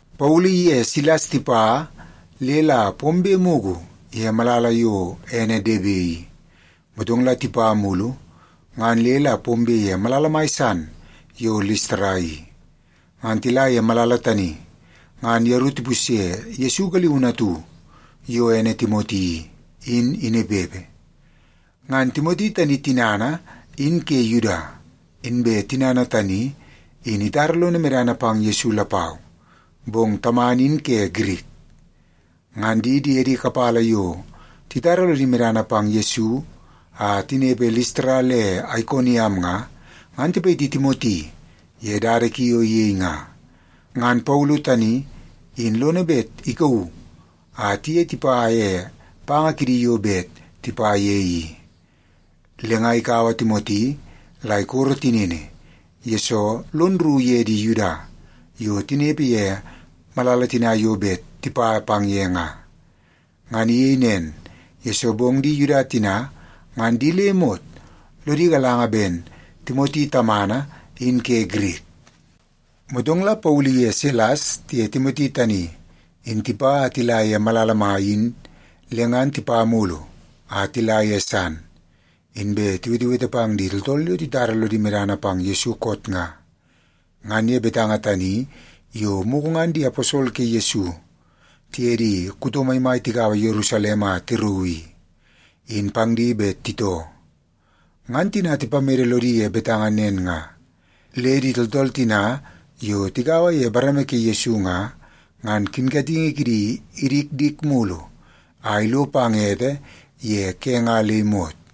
Paulu iye Silas tipa le la pombe mugu ye malala yo ene Debe i, motong la tipa mulu ngan le la pombe ye malala san yo Listara i. Ngan tila ye malala tani ngan yeru tipusye Yesu galiunu atu yo ene Timoti i, in inepepe. Ngan Timoti tani tinana in ke Yuda, inbe tinana tani in itara lono medana pang Yesu lapau, bong tamana in ke Girik. Ngan di diedi kapala yo titara lodi medana pang Yesu a tinepe Listara le Aikoniam nga, ngan tipayiti Timoti ye dada ki yo iyei nga. Ngan Paulu tani in lono bet ikauu a tiye tipa ye panga kidi yo bet tipa ye i. Le nga ikaua Timoti la ikoro tinini, yesoo lon rru ye di Yuda yo tinepe ye malala tina yo bet tipa pang ye nga. Ngan iyei nen, yesoo bong di Yuda tina ngan di le imot lodi galanga ben Timoti tamana in ke Girik. Motong la Paulu iye Silas tiye Timoti tani in tipa a tila ye malala mai in le ngan tipa mulu a tila ye san, inbe tiwetewete pang di tooltool yo titara lodi medana pang Yesu koot nga, ngan ye betanga tani yo mugu ngan di aposol ke Yesu, tiye di kuto maimai tigaua Yerusalem a tirauu i, in pang di bet titoo. Ngan tina tipamede lodi ye betanga nen nga, le di tooltool tina yo tigaua ye bareme ke Yesu nga, ngan kinkatingi kidi idikdik mulu a ilo pang ete ye ke nga le imot.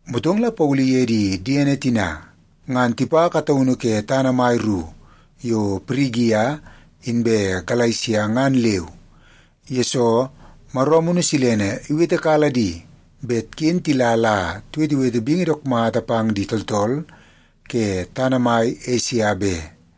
Motong la Paulu iye di diene tina ngan tipa kataunu ke tana mai ru yo Pirigia inbe Galesia ngan leu, yesoo Maro Amunu Silene iwetekala di bet ken tila la tiwetewete bingi dook mata pang di tooltool ke tana mai Esia be.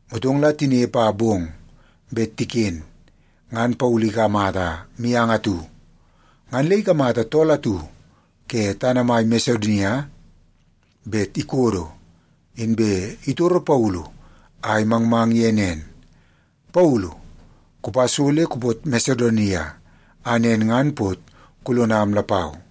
Motong la tinepe a bong bet tiken, ngan Paulu ikamata mianga atu. Ngan le ikamata tool atu ke tana mai Masedonia bet ikodo, inbe itoru Paulu a imangmang ye nen, “Paulu, kupa so le kupot Masedonia, a nen ngan pot kulonam lapau!”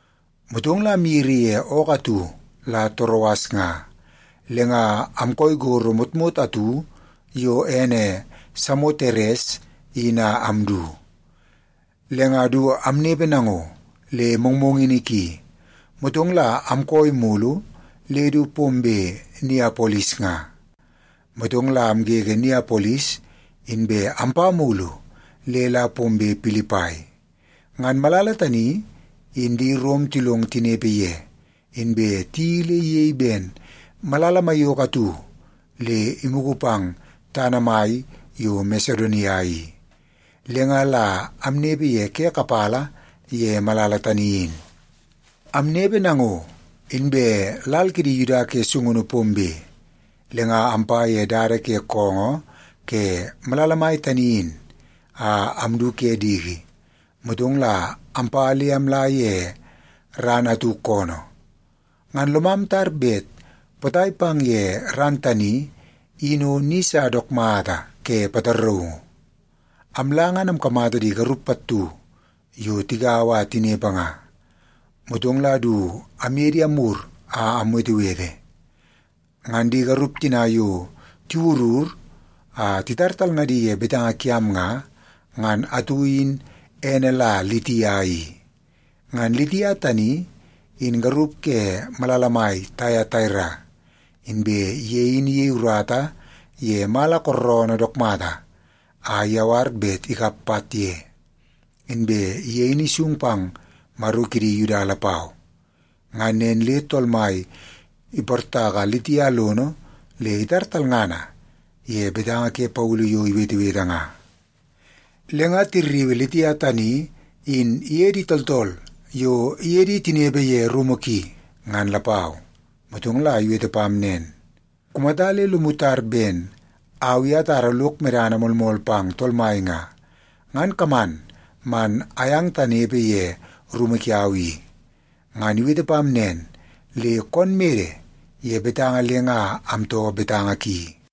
Motong la amyiri ye ookoo atu la Toroas nga, le nga amkooi gorro motmot atu yo ene Samoteres in a amdu. Le nga du amnepe nango le mongmongini ki, motong la amkooi mulu le du pombe Niapolis nga. Motong la amgege Niapolis, inbe ampa mulu le la pombe Pilipai. Ngan malala tani in di Rom tilong tinepe ye, inbe tiyeii le iyei ben malala maiyoko atu le imugu pang tana mai yo Masedonia i. Le nga la amnepe ye ke kapala ye malala tani in. Amnepe nango, inbe lal kidi Yuda ke sungunu pombe, le nga ampa ye dada ke koongoo ke malala mai tani in a amdu ke diki, motong la ampa le amla ye ran atu koonoo. Ngan lomam tar bet potai pang ye ran tani in o ni sa dook mata ke pataraungu. Amla ngan amkamata di garup pattu yo tigaua a tinepe nga. Motong la du amye di amwur a amwetewete. Ngan di garup tina yo tiwurur a titar talngadi ye betanga kiam nga, ngan atu in ene la Litia i. Ngan Litia tani in garup ke malala mai Taiataira, inbe ye in iyei urata ye mala kooroonoo dook mata a iyawar bet ikap pat ye. Inbe ye in isung pang Maro kidi Yuda lapau. Ngan nen le Tool Mai iportaka Litia lono le itar talngana ye betanga ke Paulu yo iwetewete nga. Le nga tirriui Litia tani in iye di tooltool yo iye di tinepe ye rumu ki, ngan lapau. Motong la iwete pam nen, “Kumata le lomu tar ben au i atara lok medana moolmool pang Tool Mai nga, ngan kaman man ayang tanepe ye rumu kiau i.” Ngan iwete pam nen le koon mede ye betanga le nga amtoo betanga ki.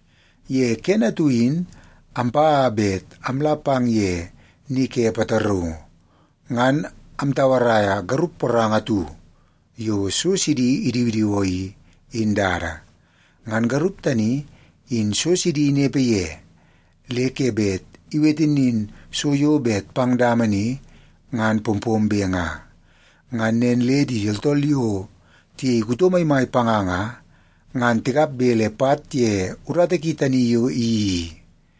Ye kene atu in ampa a bet amla pang ye ni ke pataraungu, ngan amtauaraia garup poranga atu yo so sidi idiwidiwoo i, in dada. Ngan garup tani in so sidi inepe ye le ke bet iwete nin so yo bet pang dama ni ngan pompombe nga. Ngan nen le di tooltool yo tiyei kuto maimai panga nga, ngan tikap bele pat ye urata ki tani yo iyeii i.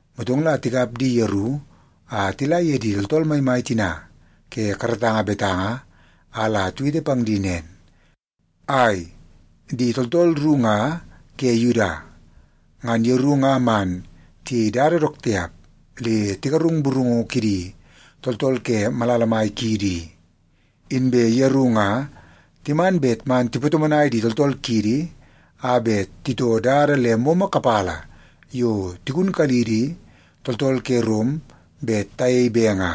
Motong la tikap di yeru a tila ye di tooltool maimai tina ke karatanga betanga a la tiwete pang di nen, “Ai, di tooltool ru nga ke Yuda, ngan yeru nga man tiyei dada dook tiap le tigarung burungu kidi tooltool ke malala mai kiidi i. Inbe yeru nga timan bet man tipatomonai di tooltool kiidi a bet titoo dada le momo kapala yo tigunkalidi tooltool ke Rom bet tayei be nga.”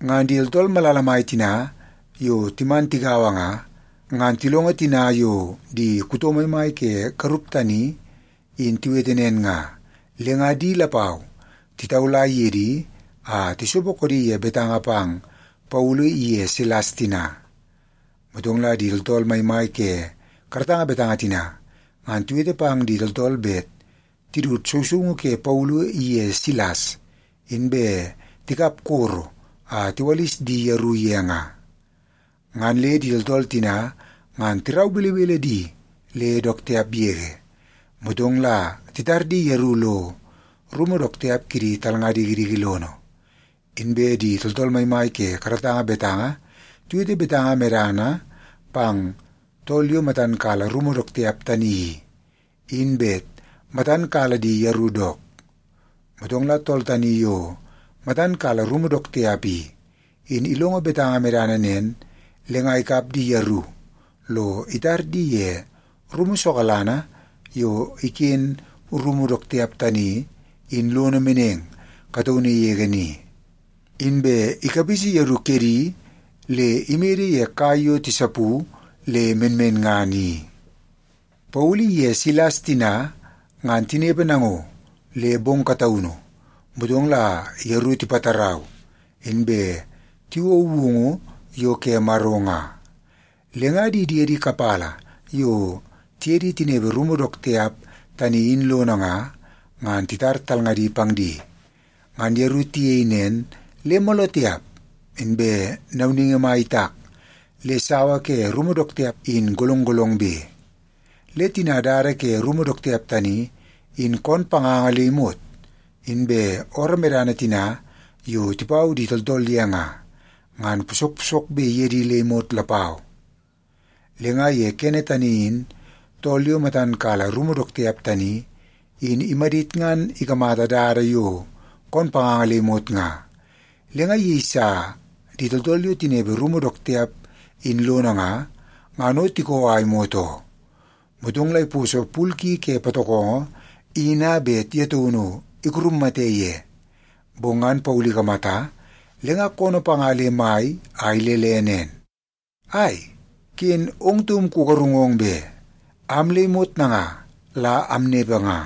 Ngan di tooltool malala mai tina yo timan tigaua nga, ngan tilongo tina yo di kuto maimai ke garup tani in tiwete nen nga, le nga di lapau titaula ye di a tisopo koodi ye betanga pang Paulu iye Silas tina. Motong la di tooltool maimai ke karatanga betanga tina ngan tiwete pang di tooltool bet tidut sousoungu ke Paulu iye Silas, inbe tikap koro a tiwalis di yeru ye nga. Ngan le di tooltool tina ngan tirau belebele di le dook tiap yege, motong la titar di yeru lo rumu dook tiap kidi talnga dikidiki lono. Inbe di tooltool maimai ke karatanga betanga tiwete betanga medana pang tool yo matan kala rumu dook tiap tani i, in bet matan kala di yeru dook. Motong la tool tani yo matan kala rumu dook tiap i, in ilongo betanga medana nen, le nga ikap di yeru lo itar di ye rumu sokalana yo iken rumu dook tiap tani in lono meneng kataunu yege ni. Inbe ikapisi yeru kedi le imede ye kai yo tisapu le menmenngana i. Paulu iye Silas tina ngan tinepe nango le bong kataunu, motong la yeru tipatarau, inbe tiwou woungu yo ke Maro nga. Le nga di diede kapala yo tiye di tinepe rumu dook tiap tani in lono nga, ngan titar talngadi pang di. Ngan yeru tiyei nen le mooloo tiap inbe nauningi mai itak le sawa ke rumu dook tiap in golong golongbe. Le tina dada ke rumu dook tiap tani in koon panganga le imot, inbe ooroo medana tina yo tipau di tooltool ye nga, ngan posok posokbe ye di le imot lapau. Le nga ye kene tani in tool yo matan kala rumu dook tiap tani, in imadit ngan ikamata dada yo koon panganga le imot nga, le nga iyeisa di tooltool yo tinepe rumu dook tiap in lono nga, ngan o tikoo a imot oo. Motong la iposo pul ki ke patokongo in a bet ye taunu ikurummate ye. Bong ngan Paulu ikamata, le nga koonoo panga le mai a ilele nen, “Ai, ken ong taum kugarungong be! Am le imot nanga la amnepe nga.”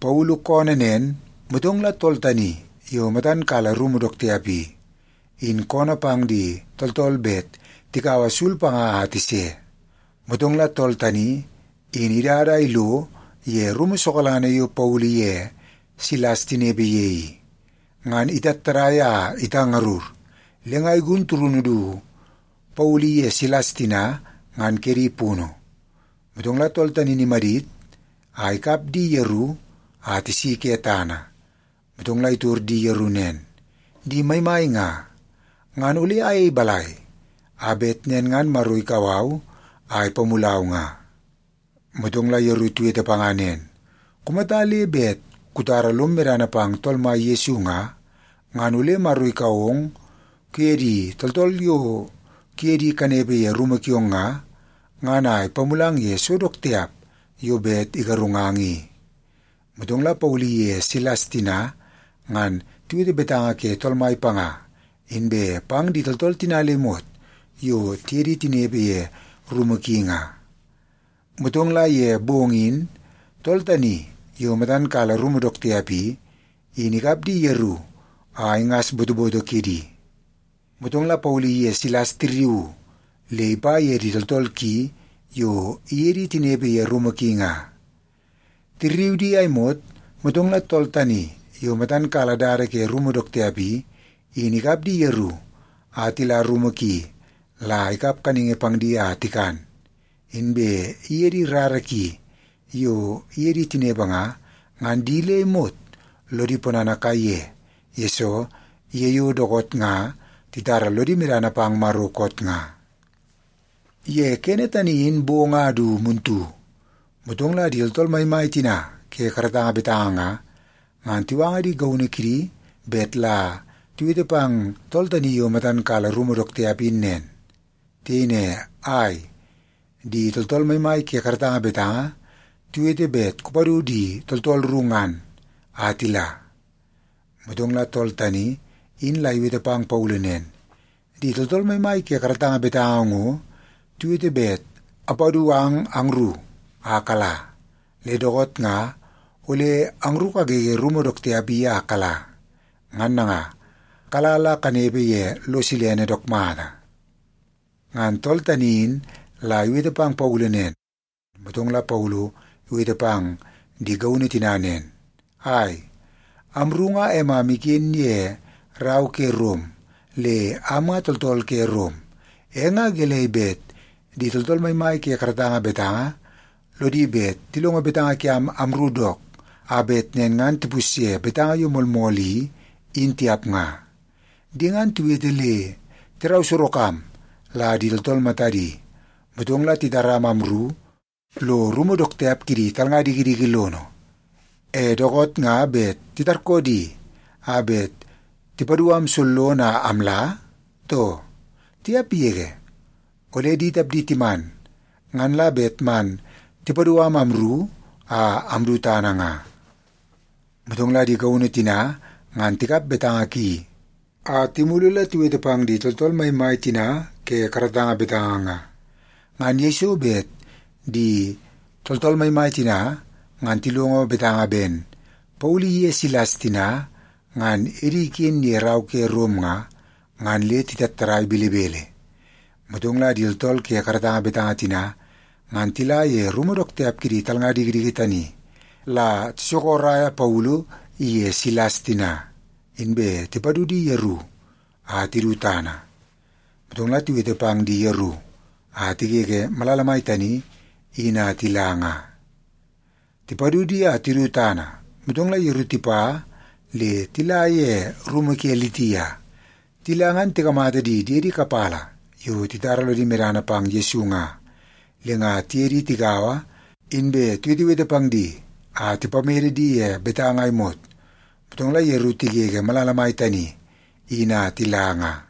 Paulu koonoo nen, motong la tool tani yo matan kala rumu dook tiap i, in koonoo pang di tooltool bet tikaua sul panga a tise. Motong la tool tani in idada a ilo ye rumu sokalana yo Paulu iye Silas tinepe ye i. Ngan itattadai a itangarur, le nga igun turunu du Paulu iye Silas tina, ngan kedi punu. Motong la tool tani in imadit a ikap di yeru a tisi ke tana, motong la itor di yeru nen, “Di maimai nga, ngan ole ayei balai, a bet nen ngan Maro ikau au a ipamulau nga?” Motong la yeru tiwete panga nen, “Kumata le bet kutara lom medana pang Tool Mai Yesu nga, ngan ole Maro ikau ong kuye di tooltool yo kuye di kanepe ye rumu kiong nga, ngan a ipamulang ye so dook tiap yo bet igarungang i.” Motong la Paulu iye Silas tina ngan tiwete betanga ke Tool Mai panga inbe pang di tooltool tina le imot yo tiye tinepe ye rumu ki nga. Motong la ye bong in tool tani yo matan kala rumu dook tiap i, in ikap di yeru a ingas botoboto kidi. Motong la Paulu iye Silas tirriuu le ipa ye di tooltool ki yo iye di tinepe ye rumu ki nga. Tirriu di a imot, motong la tool tani yo matan kala dada ke rumu dook tiap i, in ikap di yeru a tila rumu ki la ikap kaningi pang di a tikan. Inbe iye di rara ki yo iye di tinepe nga, ngan di le imot lodi ponana kaiye, yesoo ye yo dookoot nga titara lodi medana pang Maro koot nga. Ye kene tani in bong a du muntu, motong la di tooltool maimai tina ke karatanga betanga nga, ngan tiwanga di gaunu kidi bet la tiwete pang tool tani yo matan kala rumu dook tiap in nen. Tiyei ne, “Ai, di tooltool maimai ke karatanga betanga tiwete bet kupadu di tooltool ru ngan, a tila.” Motong la tool tani in la iwete pang Paulu nen, “Di tooltool maimai ke karatanga betanga ngo tiwete bet apadu ang angru a kala. Le dookoot nga ole angru kagege rumu dook tiap i a kala. Ngan nanga, kala la kanepe ye lo silene dook mata.” Ngan tool tani in la iwete pang Paulu nen, motong la Paulu iwete pang di gaunu tina nen, “Ai, amru nga emam iken ye rau ke Rom, le am nga tooltool ke Rom. E nga gelei bet di tooltool maimai ke karatanga betanga lodi bet tilongo betanga kiam amru dook a bet nen ngan tipusye betanga yo moolmool i, in tiap nga? Di ngan tiwete le tirau sorok am la di tooltool matadi, motong la titaram amru lo rumu dook tiap kidi talnga dikidiki lono. E dookoot nga bet titarkoo di a bet tipadu am sollono a amla, too? Tiap yege! Ole di tapdi timan, ngan la bet man tipadu am amru a amdu tana nga.” Motong la di gaunu tina ngan tikap betanga ki a timulu la tiwete pang di tooltool maimai tina ke karatanga betanga nga. Ngan yeiso bet di tooltool maimai tina ngan tilongo betanga ben Paulu iye Silas tina ngan edi iken ye rau ke Rom nga, ngan le titattadai belebele. Motong la di tooltool ke karatanga betanga tina ngan tila ye rumu dook tiap kidi talnga dikidiki tani la tisokoraia Paulu iye Silas tina, inbe tipadu di yeru a tidu tana. Motong la tiwete pang di yeru a tigege malala mai tani in a tila nga. Tipadu di a tidu tana, motong la yeru tipa le tila ye rumu ke Litia. Tila ngan tikamata di diedi kapala yo titara lodi medana pang Yesu nga, le nga tiye di tigaua inbe tiwetewete pang di a tipamede di ye betanga a imot, motong la yeru tigege malala mai tani in a tila nga.